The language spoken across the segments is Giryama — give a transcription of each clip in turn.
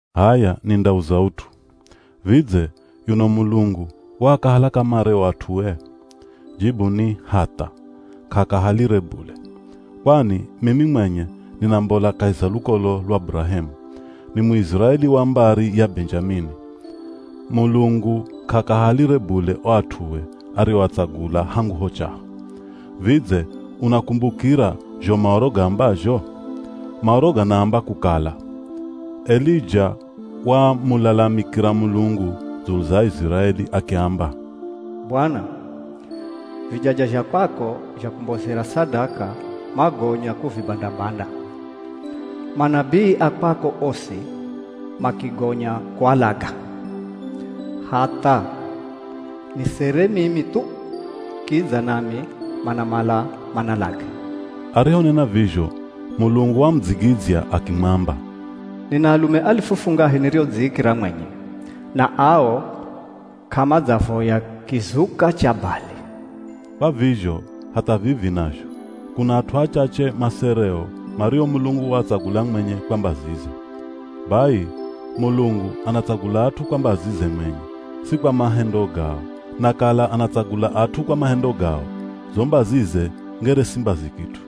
H'aya nindauza ut'u. Vidze, yuno Mulungu waakahala kamare o at'ue? Jibu ni, hatha, k'aakahalire bule. Kwani mimi mwenye ninambola kahi za lukolo lwa Burahemu. Ni Muiziraeli wa mbari ya Benjamini. Mulungu k'aakahalire bule o at'ue arioatsagula hangu ho chaho. Vidze unakumbukira zho Maoro gaambazho? Maoro ganaamba kukala, Elija wamulalamikira Mulungu dzulu za Aiziraeli akiamba, “Bwana, vijaja zha kwako zha kumbozera sadaka magonya kuvibanda-banda. Manabii a kwako osi makigonya kualaga. Hatha nisere mimi thu, kidza nami manamala manalage.” Arihonena vizho, Mulungu wamudzigidzya akimwamba, “Nina alume alifu fungahe niriodziikira mwenye, na ao k'amadzavoya kizuka cha Bali.” Kwa vizho hatha vivi nazho, kuna at'u achache masereo mario Mulungu waatsagula mwenye kwa mbazize. Bai, Mulungu anatsagula at'u kwa mbazize mwenye, si kwa mahendo gao. Na kala anatsagula at'u kwa mahendo gao, zo mbazize ngere si mbazi kit'u.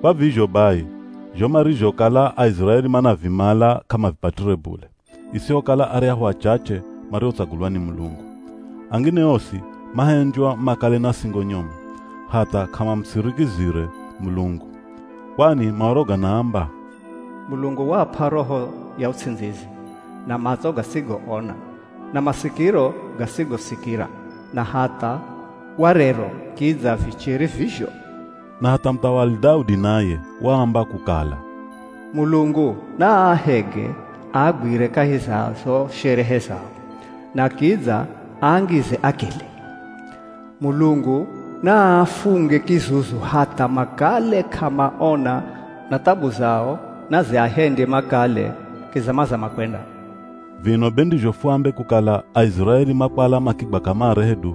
Kwa vizho bai, zho marizhokala Aiziraeli manavimala k'amavipatire bule, isihokala aryahu achache mariotsagulwa ni Mulungu. Angine osi mahendywa makale na singo nyomu, hatha k'amamusirikizire Mulungu. Kwani Maoro ganaamba, “Mulungu waap'a roho ya uts'indzizi, na matso gasigoona, na masikiro gasigosikira. Na hatha warero kidza vichere vizho.” Na hatha muthawali Daudi naye waamba kukala, “Mulungu naaahege aagwire kahi za zo sherehe zao, na kidza aangize akili. Mulungu naaafunge kizuzu hatha makale k'amaona na thabu zao naziahendye makale kizamazama kwenda.” Vino be ndizho fuambe kukala Aiziraeli makwala makigwa kamare hedu?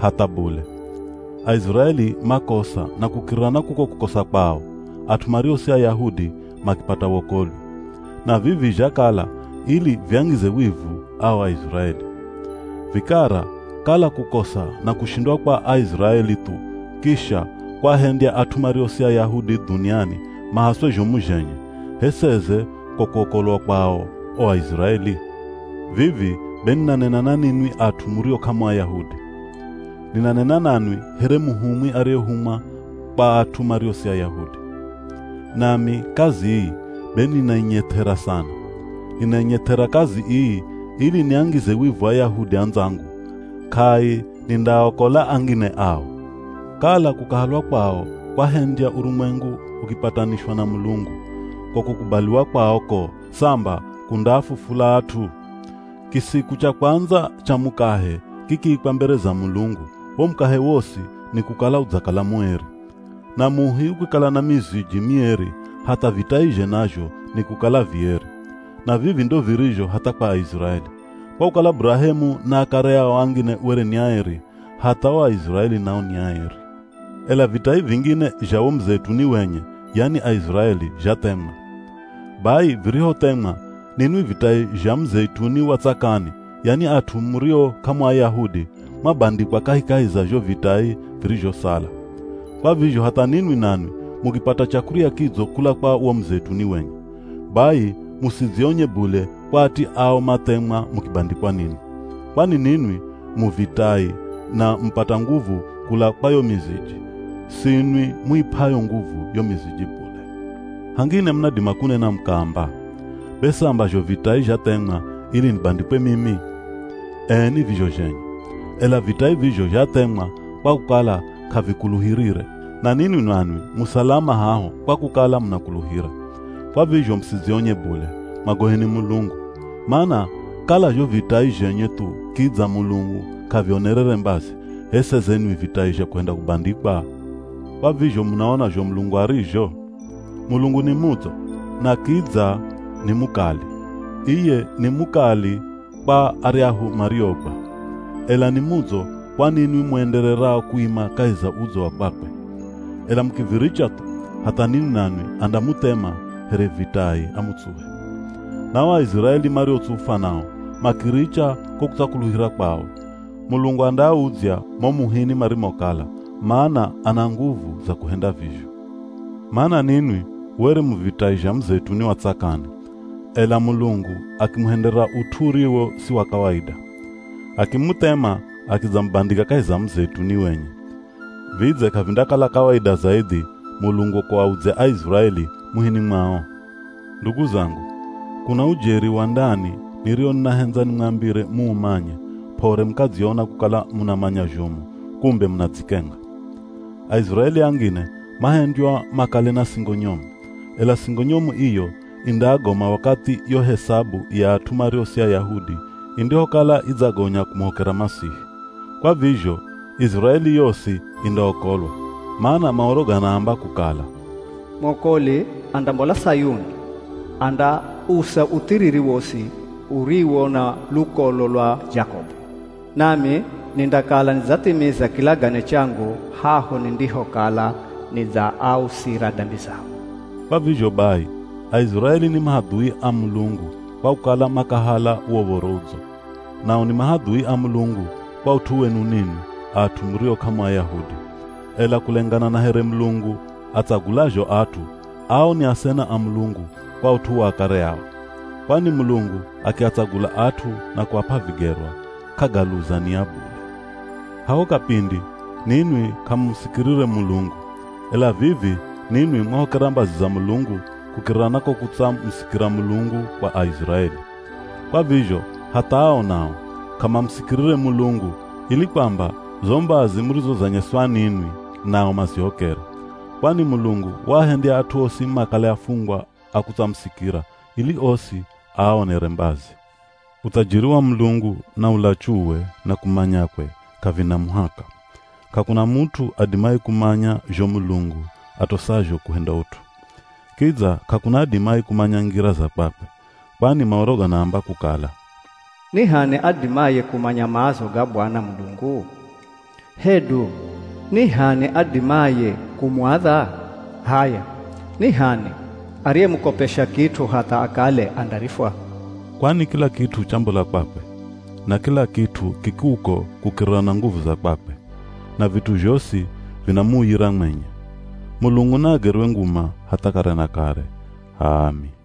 Hatha bule. Aiziraeli makosa na kukirira na kuko kukosa kwao, at'u mario si Ayahudi makipata wokolwi. Na vivi zhakala ili viangize wivu ao Aiziraeli. Vikara kala kukosa na kushindwa kwa Aiziraeli thu kisha kwaahendya at'u mario si Ayahudi dhuniani mahaswe zhomu zhenye, h'e seze ko kuokolwa kwao o Aiziraeli? Vivi be ninanena na ninwi at'u murio k'amu Ayahudi. Ninanena nanwi here muhumwi ariyehumwa kwa at'u mario si Ayahudi. Nami kazi ii be ninainyeth'era sana. Ninanyeth'era kazi ii ili niangize wivu Ayahudi andzangu, k'ai nindaaokola angine ao. Kala kukahalwa kwao kwahendya urumwengu ukipatanishwa na Mulungu, ko kukubaliwa kwao ko, samba kundaafufula at'u! Kisiku cha kwandza cha mukahe kikiikwa mbere za Mulungu, wo mukahe wosi ni kukala udzakala mueri. Na muhi ukikala na miziji mieri hatha vitaizhe nazho ni kukala vieri. Na vivi ndo virizho hatha kwa Aiziraeli. Kwa kukala Burahemu na akare ao angine were ni aeri, hatha o Aiziraeli nao ni aeri. Ela vitai vingine zha wo muzeituni wenye, yani Aiziraeli, zhathemwa. Bai virihothemwa, ninwi vitai zha muzeituni wa tsakani, yani at'u murio k'amu Ayahudi mwabandikwa kahikahi za zho vitai virizhosala. Kwa vizho hatha ninwi nanwi mukipata chakurya kidzo kula kwa wo muzeituni wenye. Bai, musidzionye bule kwa ati ao mathemwa mukibandikwa ninwi. Kwani ninwi mu vitai na mupata nguvu kula kwa yo miziji, sinwi muip'ayo nguvu yo miziji bule! Hangine munadima kunena mukaamba, “Be samba zho vitai zhathemwa ili nibandikwe mimi!” Ee ni vizho zhenye. Ela vitai vizho zhathemwa kwa kukala k'avikuluhirire. Na ninwi nanwi mu salama haho kwa kukala munakuluhira. Kwa vizho musidzionye bule, mwagoheni Mulungu. Mana kala zho vitai zhenye thu kidza Mulungu k'avionerere mbazi, h'e seze nwi vitai zha kuhenda kubandikwa? Kwa vizho munaona zho Mulungu arizho? Mulungu ni mudzo, na kidza kidza ni mukali. Iye ni mukali kwa aryahu mariogwa. Ela ni mudzo kwa ninwi muendererao kuima kahi za udzo wa kwakwe. Ela mukiviricha thu, hatha ninwi nanwi andamuthema here vitai amutsuhe. Na o Aiziraeli mariotsufwa nao, makiricha ko kutsakuluhira kwao, Mulungu andaaudzya mo muhini marimokala, mana ana nguvu za kuhenda vizho. Mana ninwi were mu vitai zha muzeituni wa tsakani, ela Mulungu akimuhendera ut'u uriwo si wa kawaida. Akimuthema akidzamubandika kahi za muzeituni wenye. Vidze k'avindakala kawaida zaidhi Mulungu kuaudzya Aiziraeli, muhini mwao? Ndugu zangu, kuna ujeri wa ndani nirio ninahendza nimwambire muumanye p'ore mukadziona kukala munamanya zhomu kumbe munadzikenga. Aiziraeli angine mahendywa makale na singo nyomu. Ela singo nyomu iyo indaagoma wakathi yo hesabu ya at'u mario si Ayahudi indihokala idzagonya kumuhokera Masihi. Kwa vizho Iziraeli yosi indaokolwa. Mana Maoro ganaamba kukala, “Mwokoli andambola Sayuni, andausa uthiriri wosi uriwo na lukolo lwa Jakobu. Nami nindakala nidzathimiza kilagane changu haho nindihokala nidzaausira dambi zao.” Kwa vizho bai, Aiziraeli ni mahadhui a Mulungu kwa kukala makahala wo Uv̱oro Udzo. Nao ni mahadhui a Mulungu kwa ut'u wenu ninwi at'u murio k'amu Ayahudi. Ela kulengana na here Mulungu atsagulazho at'u, ao ni asena a Mulungu kwa ut'u wa akare ao. Kwani Mulungu akiatsagula at'u na kuap'a vigerwa, k'agaluza nia bule. Haho kapindi ninwi k'amumusikirire Mulungu. Ela vivi ninwi mwahokera mbazi za Mulungu kukirira na ko kutsamusikira Mulungu kwa Aiziraeli. Kwa vizho hatha ao nao k'amamusikirire Mulungu ili kwamba zo mbazi murizozanyeswa ninwi nao mazihokere. Kwani Mulungu waahendya at'u osi makale afungwa a kutsamusikira ili osi aaonere mbazi. Uthajiri wa Mulungu, na ulachuwe, na kumanyakwe, k'avina muhaka! K'akuna mut'u adimaye kumanya zho Mulungu atosazho kuhenda ut'u. Kidza k'akuna adimaye kumanya ngira za kwakwe. Kwani Maoro ganaamba kukala, “Ni h'ani adimaye kumanya maazo ga Bwana Mulungu? Hedu ni h'ani adimaye kumuadha? H'aya ni h'ani ariyemukopesha kit'u hatha akale andarifwa?” Kwani kila kit'u chambola kwakwe, na kila kit'u ki kuko kukirira na nguvu za kwakwe. Na vit'u zhosi vinamuuyira mwenye. Mulungu naagerwe nguma hatha kare na kare. H'aami!